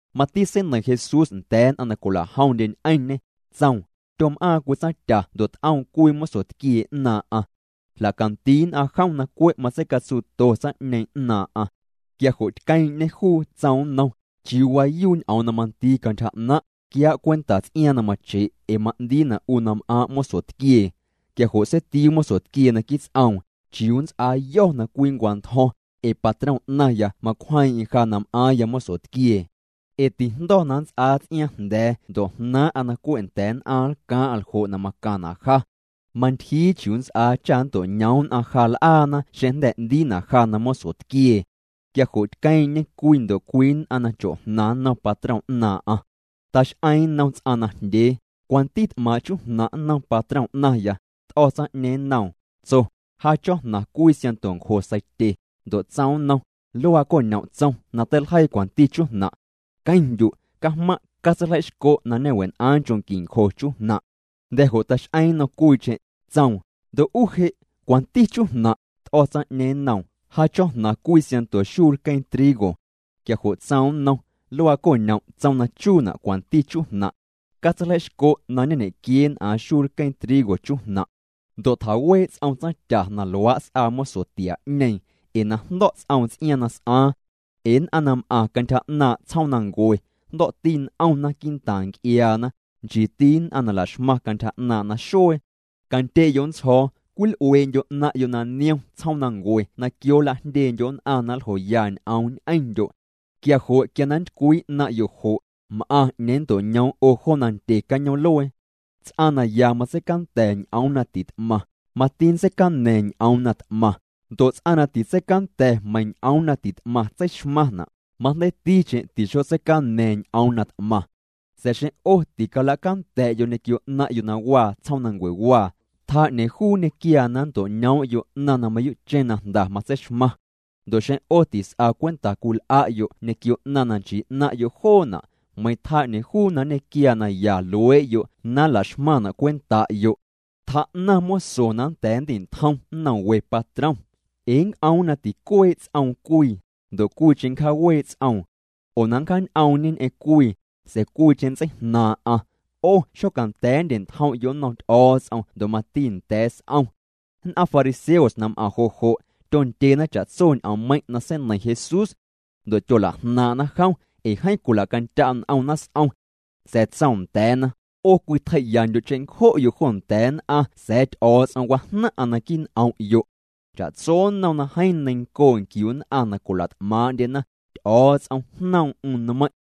Mati seineiⁿ Jesús nda̱a̱ nn'aⁿ na cwila'jomndye ñ'eⁿñê, tsoom: —Tyom'aaⁿ cwii tsaⁿtya ndo' t'oom cwii mosotquiee 'naaⁿ'aⁿ. Jla'candii nn'aⁿ jom na cwe' matseicatsuuto tsaⁿ'ñeeⁿ 'naaⁿ'aⁿ. Quia jo' tqueeⁿ'ñê juu, tsoom nnom: “¿Chiuu waayuu ñ'oom na mandii cantyja 'naⁿ'? Quiaa' cwenta ts'iaaⁿ na mache' ee ma'ndiina' 'u na m'aaⁿ' mosotquiee.” Quia jo' seitiuu mosotquiee naquii' ts'oom: “¿Chiuu nnts'aayo̱ na cwii nncwantjo̱ⁿ? Ee patrom 'naⁿya macwjeeⁿ'eⁿ ja na m'aaⁿya mosotquiee. Ee tijndo̱ na nnts'aa ts'iaaⁿ jnda̱a̱ ndo' jnaaⁿ'a na cwe' nda̱a̱ nn'aⁿ nlcaaⁿ'a ljo' na macaⁿna' ja. Mantyjii chiuu nnts'aa cha nnto'ñoom nn'aⁿ ja l'aana xeⁿ jnda̱ 'ndiina' ja na mosotquiee.” Quia jo' tqueeⁿ'ñê cwii ndo' cwii nn'aⁿ na cho'jnaⁿ nnom patrom 'naaⁿ'aⁿ. Tax'eeⁿ nnom ts'aⁿ najndyee: “¿Cwanti t'maaⁿ' chujnaⁿ' nnom patrom 'naⁿya?” T'o̱ tsaⁿ'ñeeⁿ nnoom, tso: “Ja cho̱jnaⁿ cwii siaⁿnto ncjo seitye.” Ndo' tsoom nnom: “Luaa co'ñom' tsom na teiljeii cwanti chujnaⁿ'. Queⁿndyu', cajmaⁿ', catseiljei'xco' na ñe'wen'aaⁿ nchoo' qui ncjo chujnaⁿ'.” Jnda̱ jo' tax'eeⁿ nnom cwiicheⁿ, tsoom: “Ndo' 'u je', ¿cwanti chujnaⁿ'?” T'o̱ tsaⁿ'ñeeⁿ nnoom: “Ja cho̱jnaⁿ cwii siaⁿnto xuu lqueeⁿ trigo.” Quia jo' tsoom nnom: “Luaa co'ñom' tsom na chuuna' cwanti chujnaⁿ'. Catseiljei'xco' na ñe'ñequieen'aaⁿ xuu lqueeⁿ trigo chujnaⁿ'.” Ndo' tjawee' ts'om tsaⁿtya na luaa' s'aa moso tiaa'ñeeⁿ, ee na jndo̱' ts'oom ts'iaaⁿ na s'aaⁿ. Ee nn'aⁿ na m'aⁿ cantyja 'naaⁿ' tsjoomnancuewaa, jndo̱'ti n'omna quii'ntaaⁿ nc'iaana, nchiiti nn'aⁿ na la'xmaⁿ cantyja 'naaⁿ' naxuee. ’Candye'yo' ntsjo̱o̱, cwil'uee'ndyo' 'naⁿ'yo' na niom tsjoomnancue na quio nla'jndyeendyo' nn'aⁿ na nljoya ñ'oom ñ'endyo'. Quia jo' quia na nntycwii 'naⁿ'yo' jo', m'aⁿ 'ñeeⁿ nnto'ñoom 'o jo nandye cañoom'luee. ’Ts'aⁿ na ya matseicanda̱ ñ'oom na tit'maⁿ, mati ntseicana̱a̱ⁿ ñ'oom na t'maⁿ. Ndo' ts'aⁿ na titseicanda̱ meiiⁿ ñ'oom na ti't'maⁿ tseixmaⁿna', majndeiiticheⁿ ti'xotseicana̱a̱ⁿ ñ'oom na t'maⁿ. Sa̱a̱ xeⁿ 'o ticalacanda̱'yo' ñequio 'naⁿ'yo' na waa tsjoomnancuejnaⁿwaa, tjaa 'ñeeⁿ juu nñequiaa na nnto'ñoom'yo 'naⁿ na mayuu'cheⁿ na jnda matseixmaⁿ. Ndo' xeⁿ 'o tis'a cwenta cwil'a'yo' ñequio 'naⁿ na nchii 'naⁿ'yo' joona', meiⁿ tjaa 'ñeeⁿ juu na nñequiaa naya luee'yo' na nla'xmaⁿna' cwenta'yo'. ’Tjaa'naⁿ moso na nda̱a̱ nndi'ntjom nnom we patrom. Ee nnc'oom na ticuee' ts'oom cwii, ndo' cwiicheⁿ nncjaawee' ts'oom. Oo na nncjaañ'oomñê ñ'eⁿ cwii, sa̱a̱ cwiicheⁿ nntseijnaaⁿ'aⁿ. 'O xocanda̱a̱ nndye'ntjom'yo' nnom Ty'o̱o̱ts'om ndo' mati nda̱a̱ s'om. Nn'aⁿ fariseos na m'aⁿ jo' jo', tyondyena cha'tso ñ'oommeiⁿ' na seineiⁿ Jesús. Ndo' tyola'jnaaⁿ'na jom, ee jeeⁿ cwila'candya' n'omna s'om. Sa̱a̱ tsoom nda̱a̱na: —'O cwitjei'yandyo' cheⁿncjo'yo' jo nda̱a̱ nn'aⁿ sa̱a̱ Ty'o̱o̱ts'om wajnaⁿ'aⁿ naquii' n'om'yo'. Cha'tso nnom na jeeⁿ neiⁿncoo' nquiu nn'aⁿ na cwila't'maaⁿ'ndyena, Ty'o̱o̱ts'om jnoom'm nmeiⁿ'.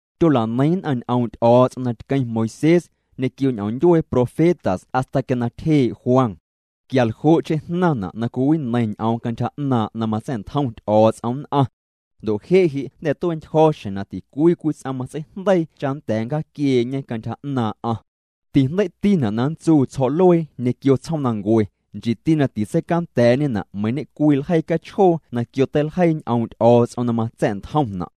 ’Tyola'neiⁿ nn'aⁿ ñ'oom' Ty'o̱o̱ts'om na tqueⁿ Moisés, ñequio ñ'oom ndyuee profetas hasta quia na tyjee' Juan. Quia ljo'cheⁿ jnaⁿna' na cwiwineiⁿ ñ'oom cantyja 'naaⁿ' na matsa̱'ntjom Ty'o̱o̱ts'om nn'aⁿ. Ndo' je' je' jnda̱ tue'ntyjo̱ xjeⁿ na ticwii cwii ts'aⁿ matseijndeii cha nnda̱a̱ nncjaaquiee'ñe cantyja 'naaⁿ'aⁿ. ’Tijndei'tina' na nntsuu tsjo̱'luee ñequio tsjoomnancue, nchiiti na titseicanda̱a̱'ñena' meiiⁿ ñe'cwii ljeii cachjoo na quio teiljeii ñ'oom' Ty'o̱o̱ts'om na matsa̱'ntjomna'.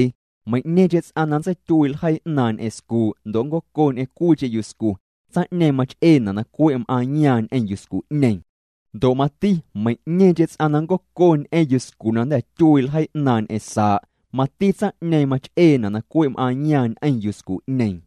’Meiⁿ'ñeeⁿcheⁿ ts'aⁿ na nntseityuii' ljeii 'naaⁿ' ñ'eⁿ scuu' ndo' nncoco ñ'eⁿ cwiicheⁿ yuscu, tsaⁿ'ñeeⁿ mach'eena' na cwe' m'aaⁿyaaⁿ ñ'eⁿ yuscu'ñeeⁿ. Ndo' mati meiⁿ'ñeeⁿcheⁿ ts'aⁿ na nncoco ñ'eⁿ yuscu na jnda̱ tyuii' ljeii 'naaⁿ' ñ'eⁿ saa', mati tsaⁿ'ñeeⁿ mach'eena' na cwe' m'aaⁿyaaⁿ ñ'eⁿ yuscu'ñeeⁿ.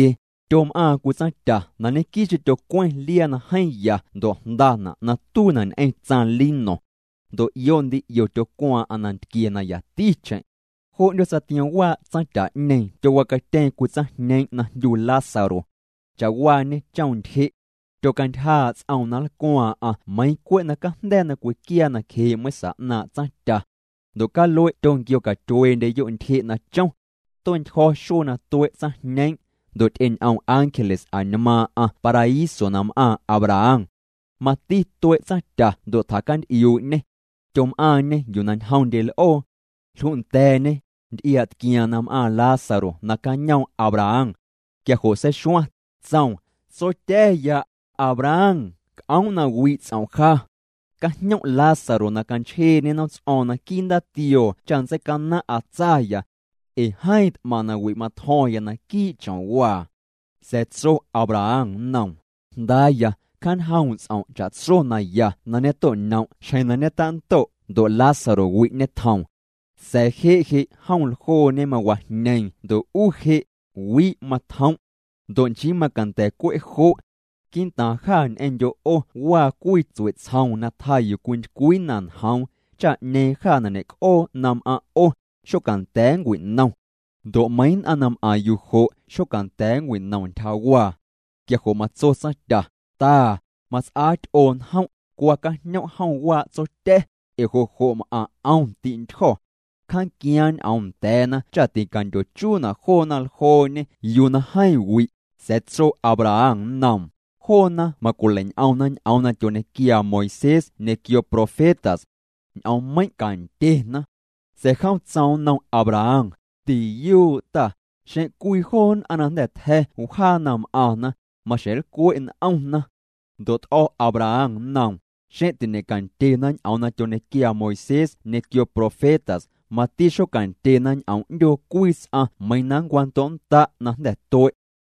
’Tyom'aaⁿ cwii tsaⁿtya na ñequii'cheⁿ tyocweⁿ liaa na jeeⁿ ya ndo' jndana' na tuiina' ñ'eⁿ tsaⁿ lino. Ndo' 'io ndii 'io tyocwaaⁿ'aⁿ nantquie na yaticheⁿ. Jo 'ndyoots'a tiom waa' tsaⁿtya'ñeeⁿ tyowacatyeeⁿ cwii tsaⁿjñeeⁿ' na jndyu Lázaro. Cha'waañê chom ntyje'. Tyocantyjaa' ts'oom na nlcwaaⁿ'aⁿ meiiⁿ cwe' na cajnda̱a̱ na cwiquiaa nacjee' meiⁿsa 'naaⁿ' tsaⁿtya. Ndo' calue' tyonquiocatyueendyeyo' ntyje' na chom. Tue'ntyjo̱ xuee na tue' tsaⁿjñeeⁿ', ndo' ty'eñ'om ángeles añmaaⁿ'aⁿ paraíso na m'aaⁿ Abraham. Mati tue' tsaⁿtya ndo' tjacanty'iuu'ñê. Tyom'aaⁿñê yuu na ñjomndye l'oo. Jlunda̱a̱ñê, nty'iaa'tquiaaⁿ na m'aaⁿ Lázaro nacañoom' Abraham. Quia jo' seixuaⁿ, tsoom: “Tsotya̱ya, Abraham, c'oom' na wi' ts'om' ja. Cajñom' Lázaro na canchjeeñê nomts'o̱o̱ⁿ naquii' ndaatioo cha nntseicanaⁿ'aⁿ tsaya. Ee jeeⁿ t'maⁿ wi' matjo̱ⁿya naquii' chomwaa.” Sa̱a̱ tso Abraham nnoom: “Jndaaya, cjaañjoom' ts'om' cha'tso na ya na ñeto'ñom' xjeⁿ na ñetando', ndo' Lázaro wi' ñetjoom. Sa̱a̱ je' je' jom ljoo mawajñeeⁿ ndo' 'u je', wi' matjom'. Ndo' nchii macanda̱ cwe' jo'. Quii'ntaaⁿ jâ ñ'eⁿndyo' 'o waa cwii tsue'tsjoom na tjaa yuu cwintycwii na njoom, cha 'ñeeⁿ jâ na ñe'c'oo na m'aⁿ' 'o, xocanda̱a̱ nncwinom. Ndo' meiⁿ nn'aⁿ nam'aⁿ yuu jo' xocanda̱a̱ nncwinom ntyjawaa.” Quia jo' matso tsaⁿtya: “Ta, mats'aa ty'oo njom', cwa cajñom' jom waa' tsotya̱, ee jo' jo' m'aⁿ 'om ti'ntyjo̱. Cjaanquiaaⁿ ñ'oom nda̱a̱na cha ticandyochuuna' joona ljooñe yuu na jeeⁿ wi'.” Sa̱a̱ tso Abraham nnoom: “Joona macwilei'ñ'omna ñ'oom na tyoñequiaa Moisés ñequio profetas. Ñ'oommeiⁿ' candyena.” Sa̱a̱ jom tsoom nnom Abraham: “Tiyuu' ta, xeⁿ cwii joo nn'aⁿ na jnda̱ tja̱ wjaa na m'aⁿna, maxjeⁿ nlcwe' n'omna.” Ndo' t'o̱ Abraham nnoom: “Xeⁿ tiñe'candyena ñ'oom na tyoñequiaa Moisés ñequio profetas, mati xocandyena ñ'oom 'ndyoo cwii ts'aⁿ meiiⁿ na nncwando'nnda' na jnda̱ tue'.”